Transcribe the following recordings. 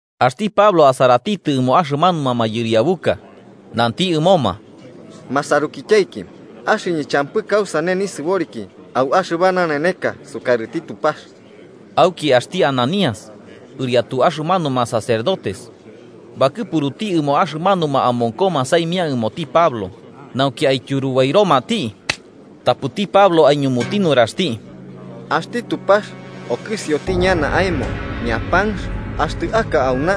Axti Pablo asaratitɨ ɨmo axɨmanuma mayɨriabuka nanti ɨmoma: –Ma sarukityaiki, axɨñɨ champɨ kausane nisɨboriki au axɨba naneneka sukarɨti Tupax. Auki axti Ananías ɨriatu axɨmanuma sacerdotes, bakɨpuruti ɨmo axɨmanuma amonkoma saimia ɨmoti Pablo, nauki aityurubairomati. Tapɨti Pablo aiñumuti nuraxti: –¡Axti Tupax okɨsioti ñana aemo, ñapanx! Axtɨ aka auna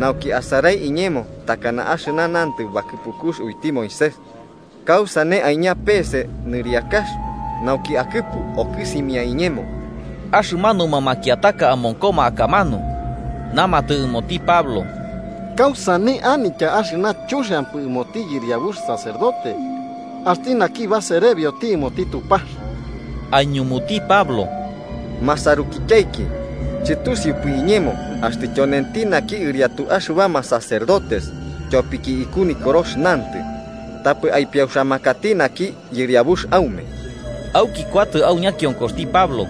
nauki asarai iñemo takana axɨna nantɨ bakɨpukux uiti Moisés, ¿kausane aiña peese nɨriakax nauki akɨpuka okɨsimia iñemo? Axɨmanuma makiataka amonkoma akamanu namatɨ ɨmoti Pablo: –¿Kausane anitya axɨna chuxiampɨ ɨmoti yɨriabux sacerdote, axti naki baserebioti ɨmoti Tupax? Aiñumuti Pablo: –Masarukityaiki, chɨtusiupɨ iñemo axtɨ tyonenti naki ɨriatu axɨbama sacerdotes. Tyopiki iku Nikorox nantɨ: ‘Tapɨ aipiauxamakati naki yɨriabux aume.’ Auki kuatɨ au ñakionkoxti Pablo,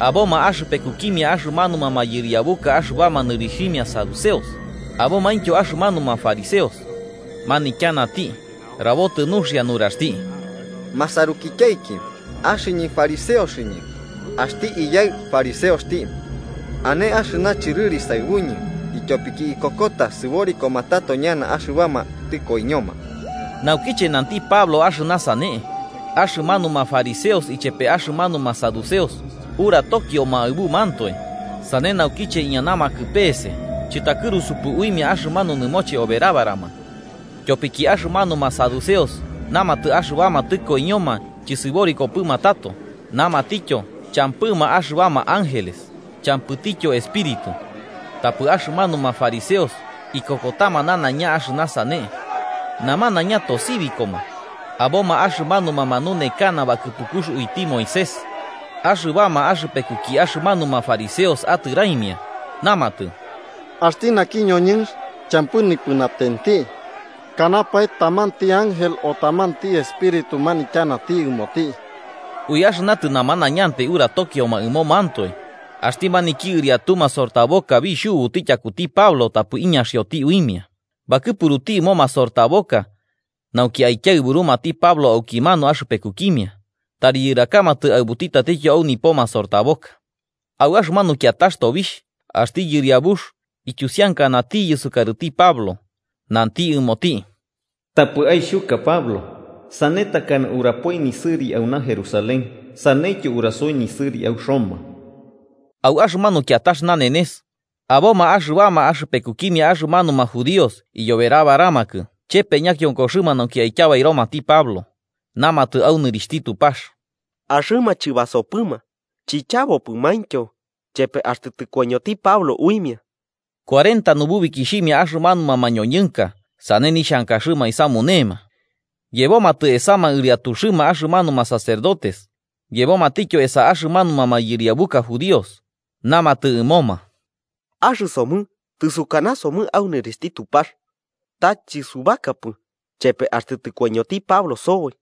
aboma axɨpekukimia axɨmanuma mayɨriabuka axɨbama nɨrixhimia saduceos abomaintyo axɨmanuma fariseos, manityanati rabotɨ nuxia nuraxti: –Masarukityaiki, axɨñɨ fariseoxɨñɨ, axti iyaɨ fariseoxti. Ane axɨna chɨrɨri saɨbuñɨ, ityopiki ikokota sɨborikoma tato ñana axɨbama tɨkoiñoma. Naukiche nanti Pablo axɨna sane, axɨmanuma fariseos ichepe axɨmanuma saduceos uratokioma aɨbumantoe sane naukiche iñanamakɨ peese chɨtakɨrusupɨ uimia axɨmanu nɨmoche oberabarama. Tyopiki axɨmanuma saduceos namatɨ axɨbama tɨkoiñoma chɨsɨborikopɨma tato, namatityo champɨma axɨbama ángeles champɨtityo espíritu. Tapɨ axɨmanuma fariseos ikokotama nanaiña axɨna sane. Namanaiña tosibikoma. Aboma axɨmanuma manunekana bakɨpukux uiti Moisés, axɨbama axɨpekuki axɨmanuma fariseos, atɨraimia namatɨ: –Axti naki ñoñɨnx champɨ nipɨnatenti. Kanapae tamanti ángel o tamanti espíritu manityanati ɨmoti. Ui axɨna tɨnamanañantai uratokioma ɨmomantoe, axti maniki ɨriatu masortaboka bixhubuti tyakuti Pablo tapɨ iñaxioti uimia, bakɨpuruti ɨmo masortaboka, nauki aikiaɨburumati Pablo aukimanu axɨpekukimia, tari yɨrakamatɨ aɨbuti tatityo au nipo masortaboka. Au axɨmanu kiatax tobixh, axti Yɨriabux ityusiankanatiyɨ sukarɨti Pablo, nanti ɨmoti: “Tapɨ aixhuka Pablo, sane takana urapoi nisɨri auna Jerusalén, saneityo urasoi nisɨri au Roma.” Au axɨmanu kiatax nanenes, aboma axɨbama axɨpekukimia axɨmanuma judíos iyoberabaramakɨ chepe ñakionkoxɨma nauki aityabairomati Pablo, namatɨ au nɨrixhti Tupax: axɨma chɨbasopɨma chichabopɨmaintyo chepe axtɨ tɨkoiñoti Pablo uimia. Cuarenta nububikixhimia axɨmanuma mañoñɨnka sane nixhankaxɨma aisamunema. Yebomatɨ esama ɨriatuxɨma axɨmanuma sacerdotes, yebomatityo esa axɨmanuma mayɨriabuka judíos, namatɨ ɨmoma: –Axɨsomɨ tɨsukanasomɨ au nɨrixhti Tupax, ta chɨsubakapɨ chepe axtɨ tɨkoiñoti Pablo soboi.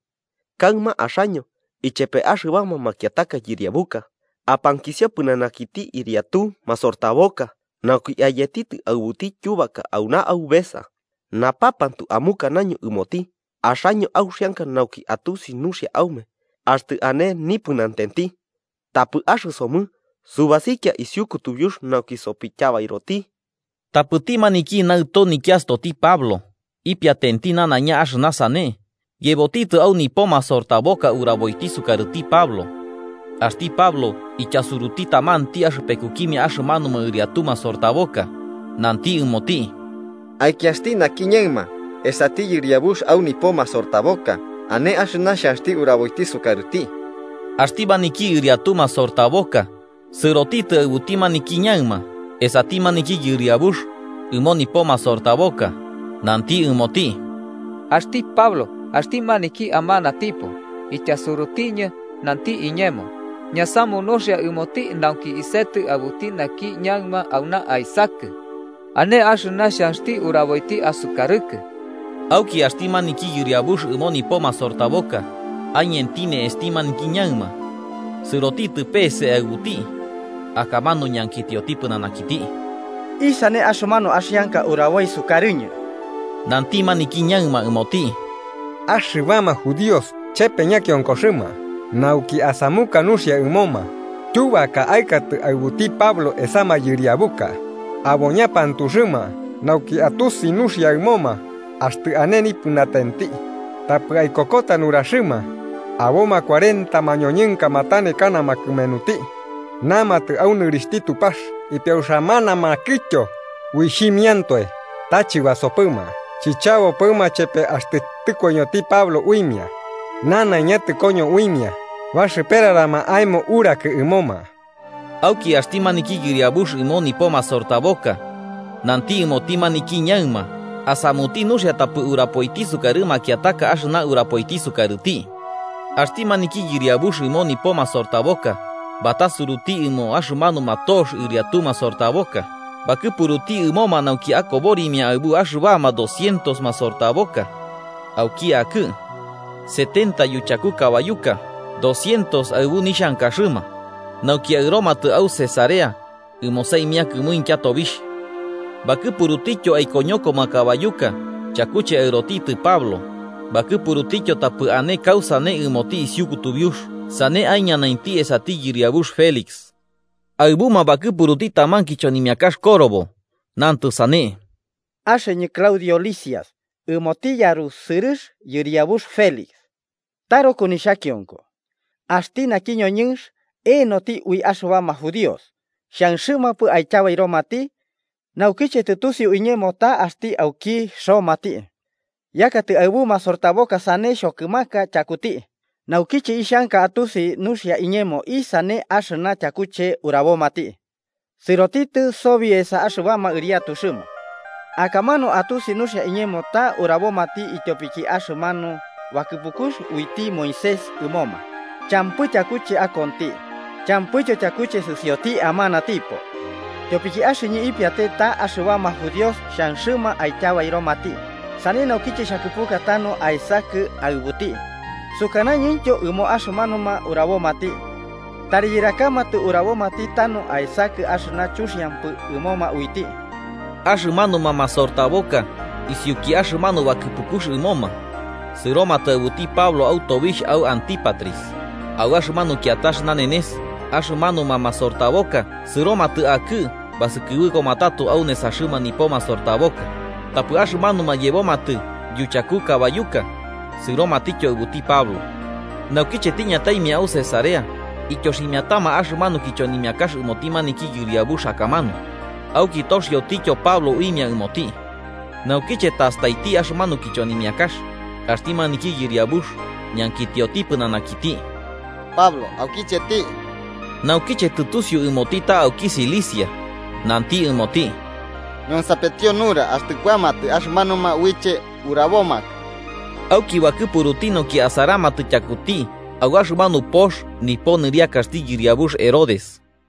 Kaɨma axaño, ichepe axɨbama makiataka yɨriabuka apankisio pɨnanakiti ɨriatu masortaboka nauki ayetitɨ aɨbuti tyubaka auna aubesa, napapantu amukanaño ɨmoti axaño auxianka nauki atusi nuxia aume axtɨ ane nipɨnatenti. Tapɨ axɨsomɨ subasikia isiu kutubiux nauki sopityabairoti. Tapɨti maniki naɨto nikiastyoti Pablo, ipiatenti nanaiña axɨna sane, yebotitɨ au nipo masortaboka uraboiti sukarɨti Pablo. Axti Pablo ityasuruti tamanti axɨpekukimia axɨmanuma ɨriatu masortaboka, nanti ɨmoti: –Aikiasti naki ñaɨma esati yɨriabux ɨmo nipo masortaboka, ane axɨna xhanxti uraboiti sukarɨti. Axti maniki ɨriatu masortaboka sɨrotitɨ aɨbuti maniki ñaɨma esati maniki yɨriabux ɨmo nipo masortaboka, nanti ɨmoti: –Axti Pablo axti maniki amanatipo, ityasurutiñɨ nanti iñemo ñasamu nuxia ɨmoti nauki isetɨ aɨbuti naki ñaɨma auna aesakɨ. Ane axɨna xhanxti uraboiti asukarɨkɨ. Auki axti maniki yɨriabux ɨmo nipo masortaboka aiñenti ne'esti maniki ñaɨma, sɨrotitɨ peese aɨbuti, akamanu ñankitioti pɨnanakiti: –¿Isane axɨmanu axianka uraboi sukarɨñɨ? Nanti maniki ñaɨma ɨmoti: –Axɨbama judíos chepe ñakionkoxɨma nauki asamuka nuxia ɨmoma tyubaka aɨkatɨ aɨbuti Pablo esa mayɨriabuka, abo ñapantuxɨma nauki atusi nuxia ɨmoma axtɨ ane nipɨnatenti. Tapɨ aikokota nuraxɨma, aboma cuarenta mañoñɨnka matanekanama kɨmenuti, namatɨ au nɨrixhti Tupax ipiauxamanamakɨtyo uixhimiantoe, ta chɨbasopɨma, chichabopɨma chepe axtɨ tɨkoiñoti Pablo uimia. Nanaiña tɨkoño uimia, baxɨperarama aemo urakɨ ɨmoma. Auki axti maniki yɨriabux ɨmo nipo masortaboka, nanti ɨmoti maniki ñaɨma asamuti nuxia tapɨ urapoiti sukarɨ makiataka axɨna urapoiti sukarɨti. Axti maniki yɨriabux ɨmo nipo masortaboka batasuruti ɨmo axɨmanuma tox ɨriatu masortaboka, bakɨpuruti ɨmoma nauki akoborimia aɨbu axɨbama docientos masortaboka auki akɨ, setenta yuchaku kabayuka docientos aɨbu nixhankaxɨma, nauki aɨromatɨ au Cesarea ɨmo saimia kɨmuintya tobixh. Bakɨpurutityo aikoñokoma kabayuka chakuche aɨrotitɨ Pablo, bakɨpurutityo tapɨ ane kausane ɨmoti isiu kutubiux sane aiñanainti esati yɨriabux Félix. Aɨbuma bakɨpuruti taman kichonimiakax korobo nantɨ sane: “Axɨñɨ Claudio Lisias ɨmoti yarusɨrɨx yɨriabux Félix: taruku nixhakionko. Axti naki ñoñɨnx, eenoti ui axɨbama judíos. Xhanxɨmampɨ aityabairomati, naukiche tɨtusiu iñemo ta axti auki romati, yakatɨ aɨbu masortaboka sane xhokɨmaka tyakuti. Naukiche ixhanka atusi nuxia iñemo isane axɨna tyakuche urabomati, sɨrotitɨ sobi esa axɨbama ɨriatuxɨma, akamanu atusi nuxia iñemo ta urabomati ityopiki axɨmanu bakɨpukux uiti Moisés ɨmoma. Champɨ tyakuche akonti, champɨityo tyakuche sɨsioti amanatipo. Tyopiki axɨñɨ ipiate ta axɨbama judíos xhanxɨma aityabairomati, sane naukiche xhakɨpuka tanu aesakɨ aɨbuti. Sukanañɨntyo ɨmo axɨmanuma urabomati, tari yɨrakamatɨ urabomati tanu aesakɨ axɨna chuxiampɨ ɨmoma uiti.” Axɨmanuma masortaboka isiuki axɨmanu bakɨpukux ɨmoma, sɨromatɨ aɨbuti Pablo au tobixh au Antípatris. Au axɨmanu kiatax nanenes, axɨmanuma masortaboka sɨromatɨ akɨ basɨkɨbɨkoma tato au nesaxɨma nipo masortaboka, tapɨ axɨmanuma yebomatɨ yuchaku kabayuka sɨromatityo aɨbuti Pablo. Naukiche tiñataimia au Cesarea, ityoximiatama axɨmanu kichonimiakax ɨmoti maniki yɨriabux akamanu, auki toxiotityo Pablo uimia ɨmoti. Naukiche tastaiti axɨmanu kichonimiakax, axti maniki yɨriabux ñankitioti pɨnanakiti Pablo aukicheti. Naukiche tɨtusiu ɨmoti ta auki Cilicia, nanti ɨmoti: –Ñonsapetio nura axtɨ kuamatɨ axɨmanuma uiche urabomakɨ. Auki bakɨpuruti nauki asaramatɨ tyakuti au axɨmanu pox nipo nɨriakaxti yɨriabux Herodes.